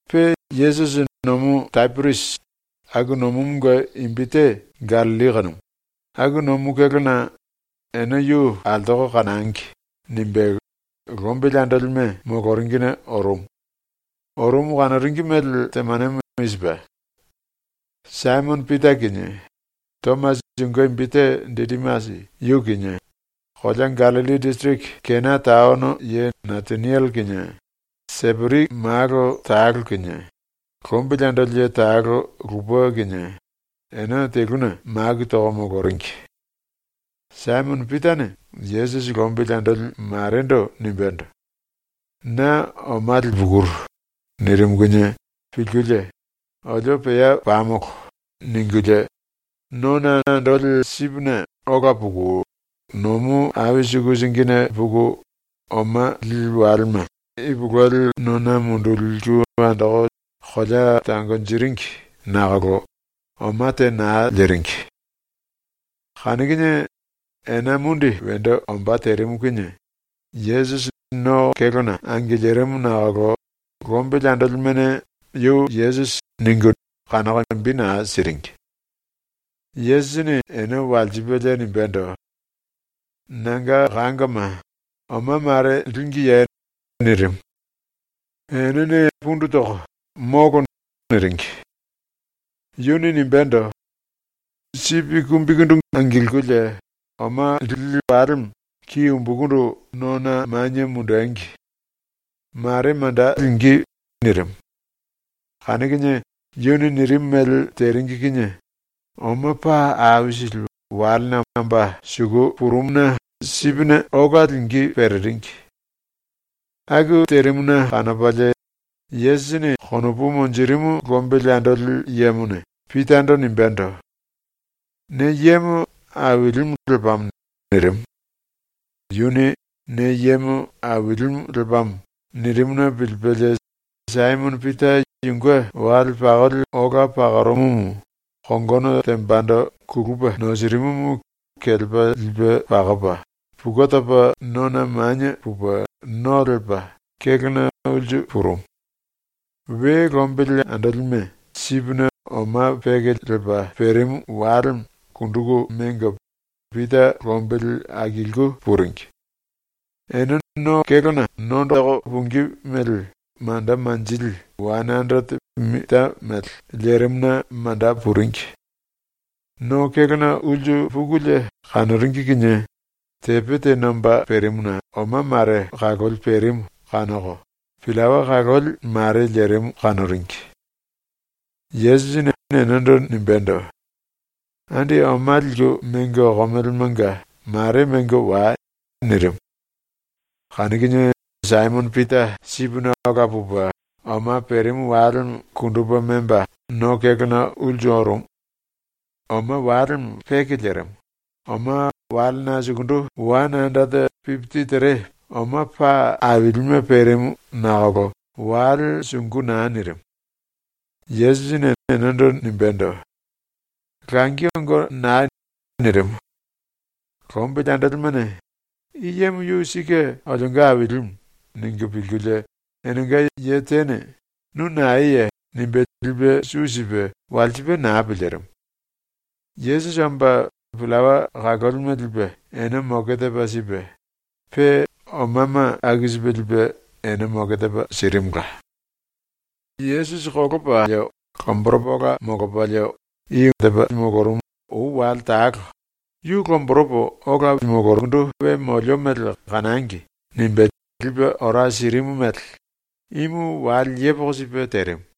Pe Yesusi Nomu Tapiriasi ⸤aku nomumunge imbi te Gallilli kanumu⸥ aku nomu kélona ‘Ene yu altoko kanangi.’ nimbe lombili andolime moloringine orumu. Orumu kanoringi mele temanemo i sipe: Saimono Pita kinie, Tomasi (yunge imbi te Didimasi) yu kinie, kolea Gallilli disiriki Kena taono ye Nataniele kinie, Seperi malo talo kinie, lombili andoli ye talo lupe kinie, ene teluna maku toko moloringi. Saimono Pitane Yesusi lombili andoli marendo nimbendo: “Na oma lipukuru.” nirimu kinie pilkulie “Olio pea pamolo.” ningulie, nona andoli sipine ola puku, nomu ai suku singine puku oma lili walema ipulueli nona munduliku andoko kolea tangonjiringi nakolo oma te naa liringi. Kanu kinie ena mundi wendo ombá terimu kinie Yesusi no kélona angilirimu nakolo lombili andolimene ‘Yu Yesusi.’ ningu kanoko imbi naa siringi. Yesusini ene walsipelie nimbendo: “Nanga kangoma, oma mare língiye?” nirimu. Enene pundu toko “Molo.” niringi. Yuni nimbendo: “Sipi kumbikundu angilkulie oma lili walemo ki umbukundu nona manie mundengi. Mare manda lingí.” nirimu. Kanu kinie yuni nirimu mele teringi kinie oma paa aisili walena omba suku purumuna sipine ola lingí pereringi. Aku terimuna kanopalie Yesusi yunge konopu monjirimu lombili andoli yemone Pitando nimbendo: “Ne yemo Ailimu lepamo.” nirimu. Yuni “Ne yemo Ailimu lepamo.” nirimuna pilipelie Saimono Pita yunge wale pakoli ola pakorumumu kongono tembando kulupe nosirimumu kelepa lipe pakopa pukue topa nona manie pupe no lepa kélona ulsu purumu. We lombili andolime sipine oma peke lepa perimu walemo kunduku mengo Pita lombili akiliku puringi. Ene no kélona nondoko pungí mele manda manjili wane anderete mita mele lerimuna manda puringi. No kélona ulsu pukulie kanoringi kinie tepe te nomba perimuna oma mare kaloli perimu kanoko, pillawa kaloli mare lerimu kanoringi. Yesusini enendo nimbendo: “Andi oma liku mengo okomelemanga mare mengo wai.” nirimu. Kanu kinie Saimono Pita sipine ola pupe oma perimu walemo kundupe memba no kélona ulsu orumu. Oma walemo peke lerimu, oma walena sukundu wane anderete pipiti tere oma paa ailime perimu nakolo wale sungu naa nirimu. Yesusini enendo nimbendo: “Langi ongo nai.” nirimu. Lombili andolimene ‘I yemo yu sike olionga Ailimu.’ ningu pilkulie enenga ye tene “Nu naeye?” nimbe lipe su sipe walsipe naa pilirimu. Yesusi omba pillawa kalolime lipe ene moke tepa sipe, pe omama aku sipe lipe ene moke tepa sirimula. Yesusi kolopa lomboropa ola molopalie ou wale talo ‘Yu lomboropo ola we molio mele kanangi.’ nimbe lipe ora sirimu mele imu wale yepoko sipe terimu.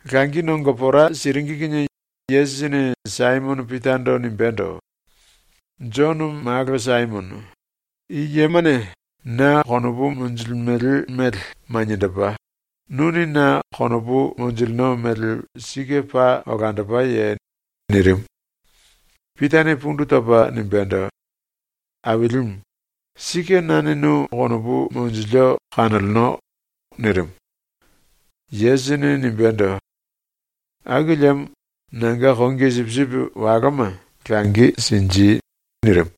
Langi nongo pora siringi kinie Yesusini Saimono Pitando nimbendo: “Jono malo Saimono, i yemane na konopu monjilimele mele maniendopa, nuni na konopu monjilino mele sike paa olandopaye?” nirimu. Pitane pundu topa nimbendo: “Ailimu, sike nane nu konopu monjilio kanoleno.” nirimu. Yesusini nimbendo: “Aku liemo nanga kongi sipisipi waloma langi sinji.” nirimu.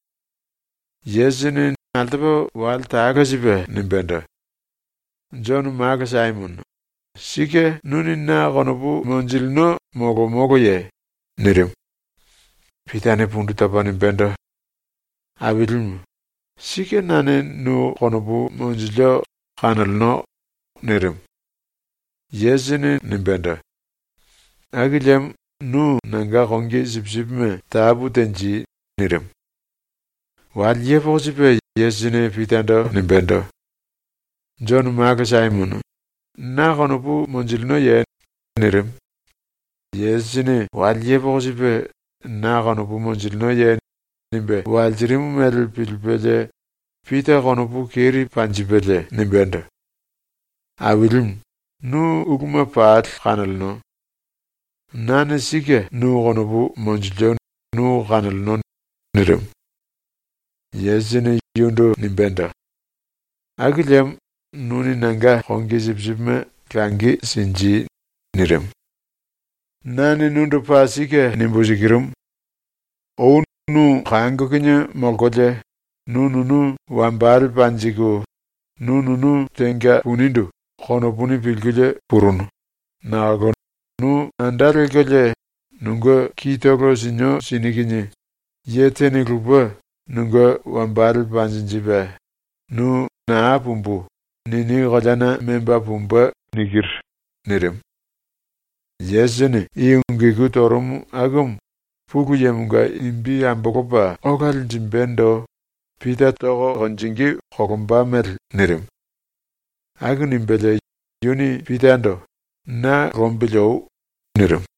Yesusini altopa wale talo sipe nimbendo: “Jono malo Saimono, sike nuni na konopu monjilino molo moloye?” nirimu. Pitane pundu topo nimbendo: “Ailimu, sike nane nu konopu monjilio kanoleno.” nirimu. Yesusini nimbendo: “Aku liemo nu nanga kongi sipisipime tapu tenji.” nirimu. Wale yepoko sipe Yesusini Pitando nimbendo: “Jono malo Saimono, na konopu monjilinoye?” nirimu. Yesusini wale yepoko sipe “Na konopu monjilinoye?” nimbe walsirimu mele pilipelie Pita konopu keri panjipelie nimbendo: “Ailimu, nu uluma pali kanoleno. Nane sike nu konopu monjilio nu kanoleno.” nirimu. Yesusini yundu nimbendo: “Aku liemo nuni nanga kongi sipisipime langi sinji.” ⸤nirimu.⸥ “Nane nundu paa sike nimbu sikirumu: Ou nu kango kinie molkolie nu nunu wambale panjiku, nu nunu tenga punindu konopuni pilkulie purunu, nakolo nu anda lelkolie nunge kitolo sinio sini kinie ye tene lupe nunge wambale panjinjipe, nu ‘naa pumbu.’ nini koleana memba pumbe.” nirimu. Yesusini ⸤i ungu iku torumu akumu⸥ Pulu Yemonga imbi ambolopa ola linjimbendo Pita tonge kolomba mele nirimu. Aku nimbelie yuni Pitando “Na lombili oi.” nirimu.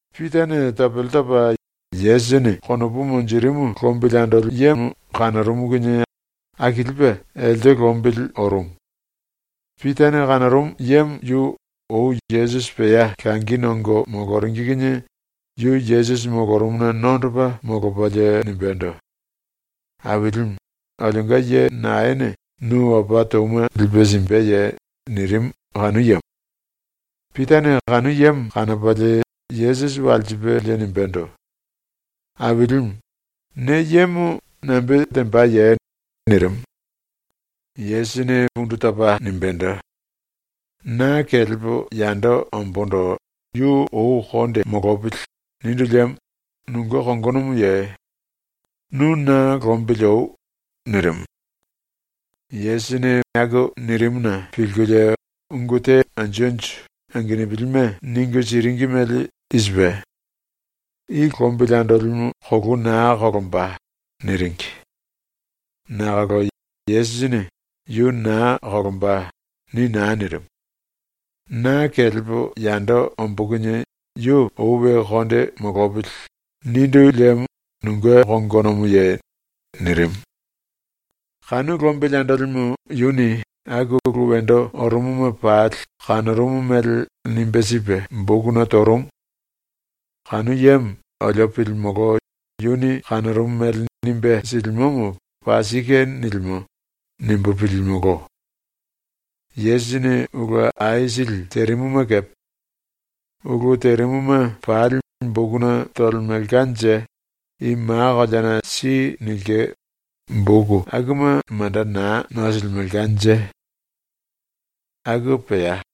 Pitane topele topa Yesusini konopu monjirimu lombili andolimu kanorumu kinie akilipe elte lombili orumu. (Pitane kanorumu yemo yu ou Yesusi pea langi nongo moloringi kinie yu Yesusi molorumuna nondopa molopalie nimbendo: “Ailimu, olionga ye naene nu opa touma lipe simbeye?” nirimu kanu yemo.) Pitane kanu yemo kanopalie Yesusi walsipelie nimbendo: “Ailimu, ne yemo nambe tembaye?” nirimu. Yesusini pundu topa nimbendo: “‘Na kelepo yando ombóndo yu ou konde molopili.’ nindu liemo nunge kongonomoye? Nu na lombili oi.” nirimu. Yesusini aku nirimuna pilkulie ungu te anju anju angenupilime ningu siringi mele i sipe: “I lombili andolimu kolou naa kolomba.” niringi. Nakolo Yesusini “Yu naa kolomba.” ni naa nirimu. “‘Na kelepo yando ombó kinie yu ou we konde molopili.’ nindu liemo nunge kongonomoye?” nirimu. Kanu lombili andolimu yuni aku ulu wendo orumuma pali kanorumu mele nimbe sipe bokuna torumu. Kanu yemo olio pilimolo ‘Yuni kanorumu mele nimbe silimomo paa sike nilimo.’ nimbu pilimolo. Yesusini ulu aisili terimuma kepe. Ulu terimuma pali bokuna tolemelkanje i ma koleana si nilke boku akuma manda naa nosilimelkanje. ⸤Aku pea.⸥